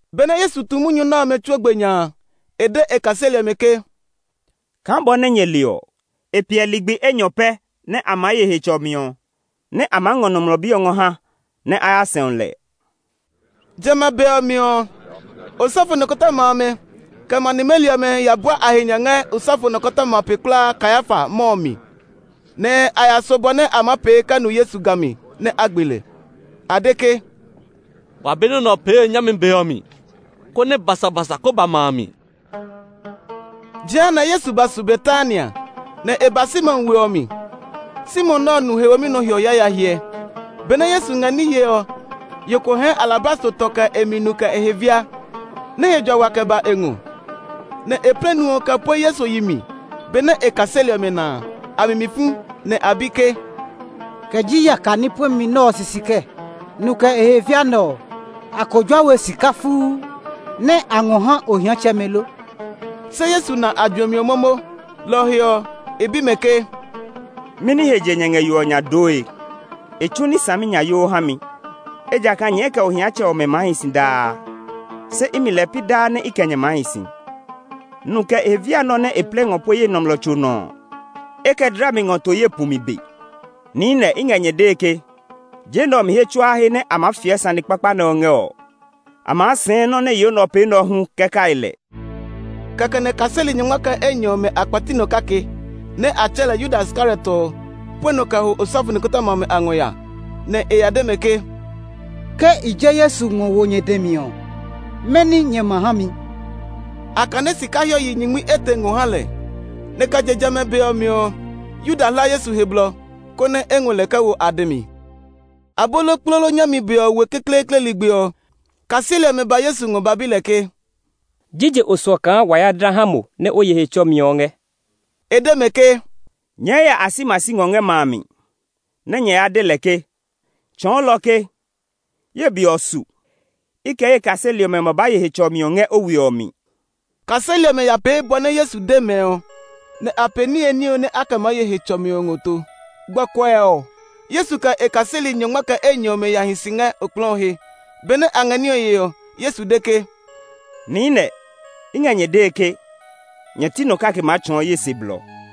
Benɛ Yesu tu munyu nɛ ɔmɛ tsuo gbe nya a, e de e kaseli ɔmɛ ke, “Kaa bɔ nɛ nyɛ le ɔ, e piɛ ligbi enyɔ pɛ nɛ a maa ye Hetsɔmi ɔ, nɛ a maa ngɔ Nɔmlɔ Bi ɔ ngɔ ha nɛ a ya sɛu lɛ.” Jamɛ a be ɔ mi ɔ, osɔfo nikɔtɔma amɛ, kɛ ma nimeli ɔmɛ ya bua a he nya ngɛ osɔfo nɔkɔtɔma pe kulaa Kayafa mɔ ɔ mi, nɛ a ya so bɔ nɛ a maa pee kɛ nu Yesu ga mi, nɛ a gbe lɛ. A de ke, “Wa be nɔ́ nɛ ɔ pee nyami be ɔ mi, konɛ basabasa kó ba ma a mi.” Jehanɛ Yesu ba su Betania, nɛ e ba Simon we ɔ mi. Simon nɛ ɔ nu he womi nɔ hiɔ yaya hyɛ. Benɛ Yesu ngɛ ní yee ɔ, yo ko hɛɛ alabastro tɔ kɛ e mi nu kɛ e he via nɛ he jua wa kɛ ba e ngɔ. Nɛ e plɛ nu ɔ kɛ pue Yesu yi mi. Benɛ e kaseli ɔmɛ na a, a mi mi fu, nɛ a bi ke, “Kɛ ji yaka ní puɛmi nɛ ɔ sisi kɛɛ? Nu kɛ e he via nɛ ɔ, a ko jua we sika fuu, nɛ a ngɔ ha ohiatsɛmɛ lo?” Se Yesu na a juɛmi ɔ momo. Lɔ ɔ he ɔ, e bi mɛ ke, “Mɛni he je nyɛ ngɛ yo ɔ nya dooe? E tsu ní tsumi saminyayoo ha mi. Ejakaa nyɛɛ kɛ ohiatsɛmɛ ɔmɛ maa hi si daa; se imi lɛɛ pi daa nɛ i kɛ nyɛ maa hi si. Nu kɛ e he via nɛ ɔ nɛ e plɛ ngɔ pue ye nɔmlɔ tso nɔ ɔ, e kɛ dla mi ngɔ to ye pumi be. Niinɛ, i ngɛ nyɛ dee ke, je nɛ ɔ mi he tsuaa he nɛ a maa fiɛ sane kpakpa nɛ ɔ ngɛ ɔ, a maa sɛɛ nɔ́ nɛ yo nɛ ɔ pee nɛ ɔ hu kɛ kai lɛ.” Kɛkɛ nɛ kaseli nyɔngma kɛ enyɔ ɔmɛ a kpɛti nɔ kake nɛ a tsɛɛ lɛ Yuda Iskariot ɔ pue nɔ kɛ ho osɔfo nikɔtɔma amɛ a ngɔ ya, nɛ e ya de mɛ ke, “Ke i je Yesu ngɔ wo nyɛ dɛ mi ɔ, mɛni nyɛ ma ha mi?” A kane sika hiɔ yi nyingmi etɛ ngɔ ha lɛ, nɛ kɛ je jamɛ a be ɔ mi ɔ, Yuda hla Yesu he blɔ, konɛ e ngɔ lɛ kɛ wo a dɛ mi. Abolokplolo nyami be ɔ we kekleekle ligbi ɔ, kaseli ɔmɛ ba Yesu ngɔ ba bi lɛ ke, “Jije o suɔ kaa wa ya dla ha mo nɛ o ye Hetsɔmi ɔ ngɛ?” E de mɛ ke, “Nyɛɛ ya asimasi ngɔ ngɛ ma a mi, nɛ nyɛ ya de lɛ ke, ‘Tsɔɔlɔ ɔ ke, Ye be ɔ su; i kɛ ye kaseli ɔmɛ ma ba ye Hetsɔmi ɔ ngɛ o we ɔ mi.’” Kaseli ɔmɛ ya pee bɔ nɛ Yesu de mɛ ɔ, nɛ a pee niye ní ɔ nɛ a kɛ maa ye Hetsɔmi ɔ ngɔ to. Gbɔkuɛ ɔ, Yesu kɛ e kaseli nyɔngma kɛ enyɔ ɔmɛ ya hi si ngɛ okplɔɔ ɔ he. Benɛ a ngɛ ní ɔ yee ɔ, Yesu de ke, “Niinɛ, i ngɛ nyɛ dee ke, nyɛ ti nɔ kake maa tsɔɔ ye se blɔ.”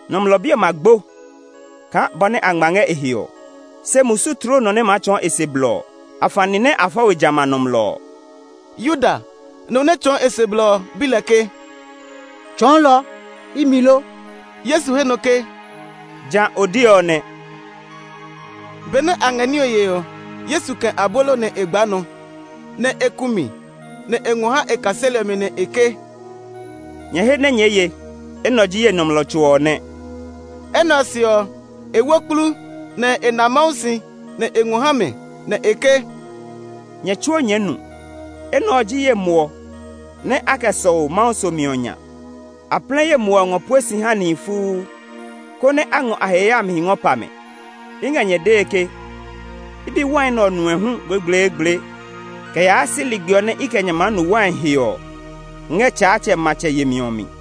Nɔmlɔ Bi ɔ ma gbo kaa bɔ nɛ a ngma ngɛ e he ɔ, se musu tloo nɔ nɛ maa tsɔɔ e se blɔ ɔ! Afani nɛ a fɔ we jamɛ a nɔmlɔ ɔ!” Yuda, nɔ nɛ tsɔɔ e se blɔ ɔ, bi lɛ ke, “Tsɔɔlɔ, imi lo?” Yesu he nɔ ke, “Ja o de ɔ nɛ.” Benɛ a ngɛ ní ɔ yee ɔ, Yesu kɛ̃ abolo nɛ e gbaa nɔ, nɛ e ku mi, nɛ e ngɔ ha e kaseli ɔmɛ, nɛ e ke, “Nyɛ he nɛ nyɛɛ ye! Enɛ ɔ ji ye nɔmlɔ tso ɔ nɛ.” Enɛ ɔ se ɔ, e wo kplu, nɛ e na Mawu si, nɛ e ngɔ ha mɛ, nɛ e ke, “Nyɛ tsuo nyɛɛ nu. Enɛ ɔ ji ye muɔ nɛ a kɛ sɔu Mawu somi ɔ nya. A plɛ ye muɔ ɔ ngɔ pue si ha nihi fuu, konɛ a ngɔ a he yayamihi ngɔ pa mɛ. I ngɛ nyɛ dee ke, i be wai nɛ ɔ nue hu gblegbleegble kɛ yaa si ligbi ɔ nɛ i kɛ nyɛ maa nu wai he ɔ ngɛ Tsaatsɛ matsɛ yemi ɔ mi.”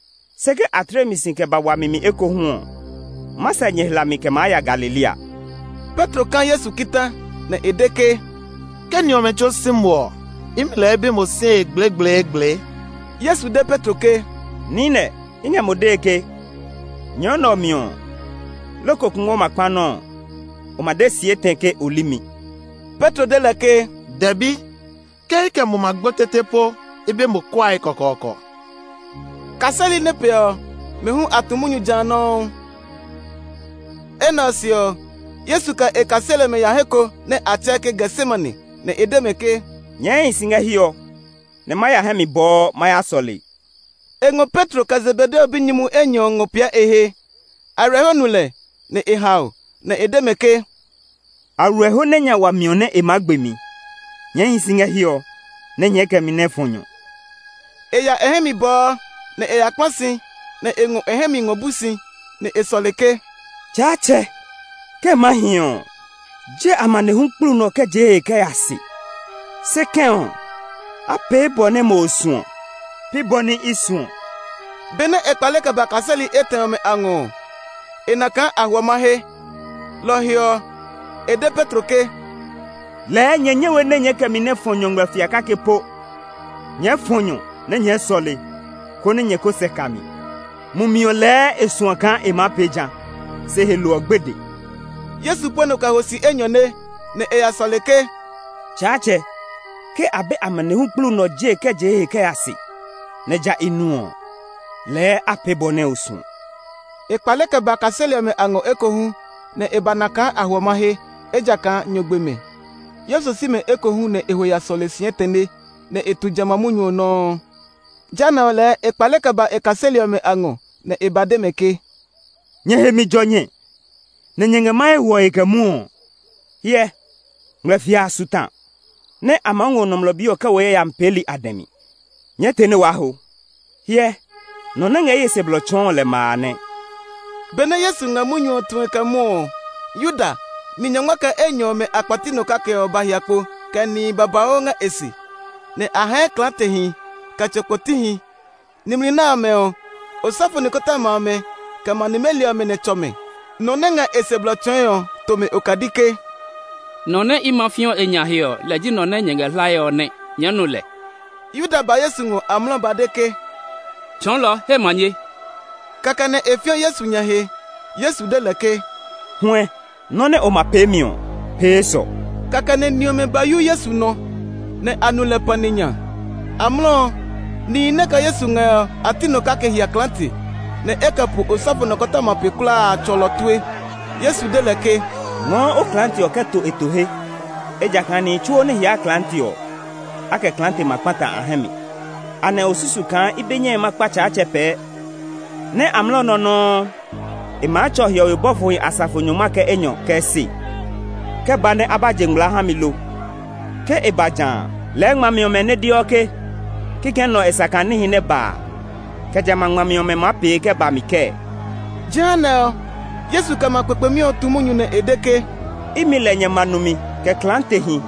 Se ke a tle mi si kɛ ba wami mi ekohu ɔ, ma sɛ nyɛ hlami kɛ maa ya Galilea.” Petro ka Yesu kita, nɛ e de ke, “Ke ni ɔmɛ tsuo si mo ɔ, imi lɛɛ i be mo sie gblegbleegble!” Yesu de Petro ke, “Niinɛ, i ngɛ mo dee ke, nyɔ nɛ ɔ mi ɔ, loko kungwɔ ma kpa nɔ́ ɔ, o ma de si etɛ ke o li mi.” Petro de lɛ ke, “Dɛbi! Ke i kɛ mo ma gbo tete po, i be mo kuae kɔkɔɔkɔ!” Kaseli nɛ piɛ ɔ, mɛ hu a tu munyu ja nɔuu. Enɛ ɔ se ɔ, Yesu kɛ e kaseli ɔmɛ ya he ko nɛ a tsɛɛ ke Getsemane, nɛ e de mɛ ke, “Nyɛɛ hi si ngɛ hiɛ ɔ, nɛ ma ya hɛ mi bɔɔ ma ya sɔle.” E ngɔ Petro, kɛ Zebedeo binyumuhi enyɔ ɔmɛ ngɔ piɛ e he. Aywilɛho nu lɛ, nɛ e hao; nɛ e de mɛ ke, “Aywilɛho nɛ nya wa miɔ nɛ e maa gbe mi; nyɛɛ hi si ngɛ hiɛ ɔ nɛ nyɛɛ kɛ mi nɛ fɔ nyɔ.” E ya e hɛ mi bɔɔ, nɛ e ya kpla si, nɛ e ngɔ e hɛ mi ngɔ bu si, nɛ e sɔle ke, “Tsaatsɛ, ke e maa hi ɔ, je amanehlu kplu nɛ ɔ kɛ je ye he kɛ ya se! Se kɛ̃ ɔ, a pee bɔ nɛ mo o suɔ; pi nɔ́ nɛ i suɔ.” Benɛ e kpale kɛ ba kaseli etɛ ɔmɛ a ngɔ ɔ, e na kaa a hwɔ mahe. Lɔ ɔ he ɔ, e de Petro ke, “Lɛɛ nyɛ nyɛ we nɛ nyɛɛ kɛ mi nɛ fɔ nyɔ ngmlɛfia kake po? Nyɛɛ fɔ nyɔ nɛ nyɛɛ sɔle, konɛ nyɛ ko sɛ ka mi. Mumi ɔ lɛɛ e suɔ kaa e maa pee jã, se he lo ɔ gbede.” Yesu pue nɔ kɛ ho si enyɔne, nɛ e ya sɔle ke, “Tsaatsɛ, ke a be amanehlu kplu nɛ ɔ jee kɛ je ye he kɛ ya se, nɛ ja i nu ɔ, lɛɛ a pee bɔ nɛ o suɔ.” E kpale kɛ ba kaseli ɔmɛ a ngɔ ekohu, nɛ e ba na kaa a hwɔ mahe, ejakaa nyɔ gbe mɛ. Yesu si mɛ ekohu, nɛ e ho ya sɔle si etɛne, nɛ e tu jamɛ a munyu ɔ nɔuu. Jehanɛ ɔ lɛɛ e kpale kɛ ba e kaseli ɔmɛ a ngɔ, nɛ e ba de mɛ ke, “Nyɛ he mi jɔ nyɛ nɛ nyɛ ngɛ mahe hwɔe kɛ mwɔɔ? Hyɛ! Ngmlɛfia a su ta, nɛ a maa ngɔ Nɔmlɔ Bi ɔ kɛ wo yayami peeli a dɛ mi. Nyɛɛ te nɛ waa ho. Hyɛ, nɔ nɛ ngɛ ye se blɔ tsɔɔe ɔ lɛ ma a nɛ!” Benɛ Yesu ngɛ munyu ɔ tue kɛ mwɔɔ ɔ, Yuda, ni nyɔngma kɛ enyɔ ɔmɛ a kpɛti nɔ kake ɔ ba hia kpo kɛ nihi babauu ngɛ e se; nɛ a hɛɛ klaatehi kɛ tso kpotihi. Nimli nɛ ɔmɛ ɔ, osɔfo nikɔtɔma amɛ; kɛ ma nimeli ɔmɛ nɛ tsɔ mɛ. Nɔ nɛ ngɛ e se blɔ tsɔɔe ɔ to mɛ okadi ke, “Nɔ nɛ i ma fĩɔ e nya he ɔ, lɛ ji nɔ nɛ nyɛ ngɛ hlae ɔ nɛ. Nyɛɛ nu lɛ!” Yuda ba Yesu ngɔ amlɔ ba de ke, “Tsɔɔlɔ he manye.” Kɛkɛ nɛ e fiɔ Yesu nya he. Yesu de lɛ ke, “Huɛ, nɔ́ nɛ o ma peemi ɔ, pee esɔ!” Kɛkɛ nɛ ni ɔmɛ ba yu Yesu nɔ, nɛ a nu lɛ pani nya. Amlɔ ɔ, nihi nɛ kɛ Yesu ngɛ ɔ a ti nɔ kake hia klaate, nɛ e kɛ po osɔfo nɔkɔtɔma pe kulaa a tsɔlɔ tue. Yesu de lɛ ke, “Ngɔɔ o klaate ɔ ngɔ to e to he; ejakaa nihi tsuo nɛ hiaa klaate ɔ, a kɛ klaate ma kpata a hɛ mi. Anɛ o susu kaa i be nyɛe ma kpa Tsaatsɛ pɛɛ, nɛ amlɔ nɛ ɔ nɔuu e maa tsɔ hiɔwe bɔfohi asafo nyɔngma kɛ enyɔ kɛ se kɛ ba nɛ a ba je ngmlaa ha mi lo? Ke e ba jã a, lɛɛ ngmami ɔmɛ nɛ deɔ ke kikɛ nɛ ɔ e sa kaa níhi nɛ ba a, kɛ jamɛ a ngmami ɔmɛ maa pee kɛ ba mi kɛɛ?” Jehanɛ ɔ, Yesu kɛ ma kpekpemi ɔ tu munyu nɛ e de ke, “Imi lɛ nyɛ ma numi kɛ klaatehi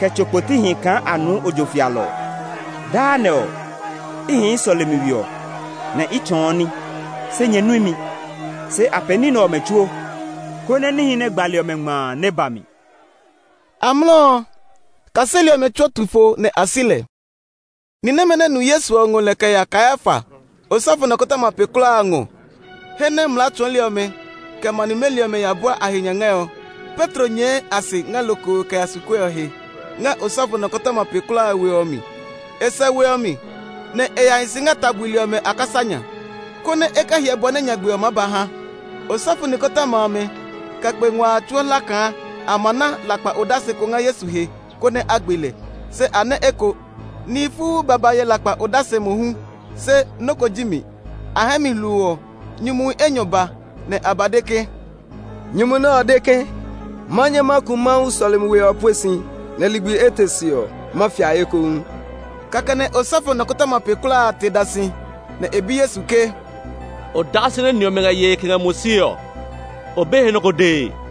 kɛ tso kpotihi kaa a nuu ojo fialɔ ɔ? Daa nɛ ɔ, i hii sɔlemi we ɔ, nɛ i tsɔɔ ní, se nyɛ nui mi. Se a pee ní nɛ ɔmɛ tsuo, konɛ níhi nɛ gbali ɔmɛ ngma a nɛ ba mi.” Amlɔ ɔ, kaseli ɔmɛ tsuo tu fo nɛ a si lɛ. Ni nɛmɛ nɛ nu Yesu ɔ ngɔ lɛ kɛ ya Kayafa, osɔfo nɔkɔtɔma pe kulaa a ngɔ, he nɛ mlaa tsɔɔli ɔmɛ, kɛ ma nimeli ɔmɛ ya bua a he nya ngɛ ɔ. Petro nyɛɛ a se ngɛ lokoo kɛ ya su kue ɔ he, ngɛ osɔfo nɔkɔtɔma pe kulaa a we ɔ mi. E sɛ we ɔ mi, nɛ e ya hi si ngɛ ta buli ɔmɛ a kasa nya, konɛ e kɛ hyɛ bɔ nɛ nyagbe ɔ maa ba ha. Osɔfo nikɔtɔma amɛ, kɛ kpe ngua a tsuo hla kaa a maa na lakpa odase ko ngɛ Yesu he, konɛ a gbe lɛ; se a nɛ eko. Nihi fuu ba ba ye lakpa odase mohu, se nɔ́ ko ji mi. A hɛɛ mi hluu ɔ, nyumuhi enyɔ ba, nɛ a ba de ke, “Nyumu nɛ ɔ de ke, ‘Ma nyɛ ma ku Mawu sɔlemi we ɔ pue si, nɛ ligbi etɛ se ɔ, ma fia ekohu.’” Kɛkɛ nɛ osɔfo nɔkɔtɔma pe kulaa a te da si, nɛ e bi Yesu ke, “Odase nɛ ni nɛ ɔmɛ ngɛ yee kɛ ngɛ mo sie ɔ, o be he nɔ́ ko dee?”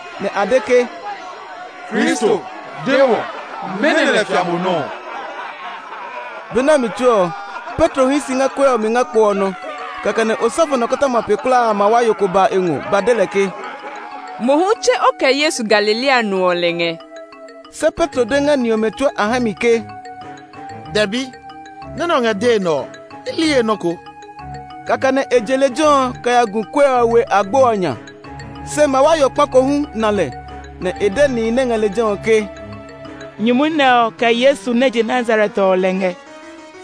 nɛ a de ke, “Kristo, de wɔ! Mɛnɔ lɛ fia mo nɔ́ ɔ?” Be nɛ ɔ mi tsuo ɔ, Petro hii si ngɛ kue ɔ mi ngɛ kpo ɔ nɔ. Kɛkɛ nɛ osɔfo nɔkɔtɔma pe kulaa a mawayo ko ba e ngɔ ba de lɛ ke, “Mo hu tse o kɛ Yesu, Galilea no ɔ lɛ ngɛ!” Se Petro de ngɛ ni ɔmɛ tsuo a hɛ mi ke, “Dɛbi! Nɔ́ nɛ o ngɛ dee nɛ ɔ, i li he nɔ́ ko.” Kɛkɛ nɛ e je lejɛ ɔ kɛ ya gu kue ɔ we agbo ɔ nya. Se mawayo kpa ko hu na lɛ, nɛ e de nihi nɛ ngɛ lejɛ ɔ ke, “Nyumu nɛ ɔ kɛ Yesu nɛ je Nazaret ɔ lɛ ngɛ.”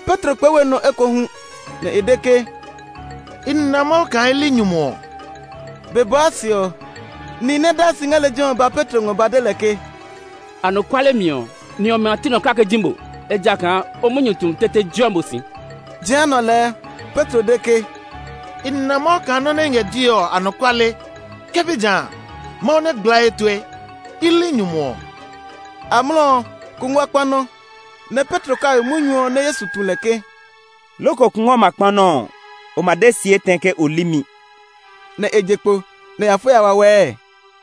Petro kplɛɛ we nɔ ekohu, nɛ e de ke, “I na Mawu kaa i li nyumu ɔ!” Be bɔɔ se ɔ, nihi nɛ daa si ngɛ lejɛ ɔ ba Petro ngɔ ba de lɛ ke, “Anɔkuale mi ɔ, ni ɔmɛ a ti nɔ kake ji mo; ejakaa o munyu tumi tete jeɔ mo si!” Jehanɛ ɔ lɛɛ, Petro de ke, “I na Mawu kaa nɔ́ nɛ i ngɛ dee ɔ, anɔkuale! Ke pi ja a, Mawu nɛ gbla ye tue! I li nyumu ɔ!” Amlɔ ɔ, kungwɔ kpa nɔ́. Nɛ Petro kai munyu ɔ nɛ Yesu tu lɛ ke, “Loko kungwɔ ma kpa nɔ́ ɔ, o ma de si etɛ ke o li mi” ɔ. Nɛ e je kpo, nɛ e ya fo ya wawɛɛ.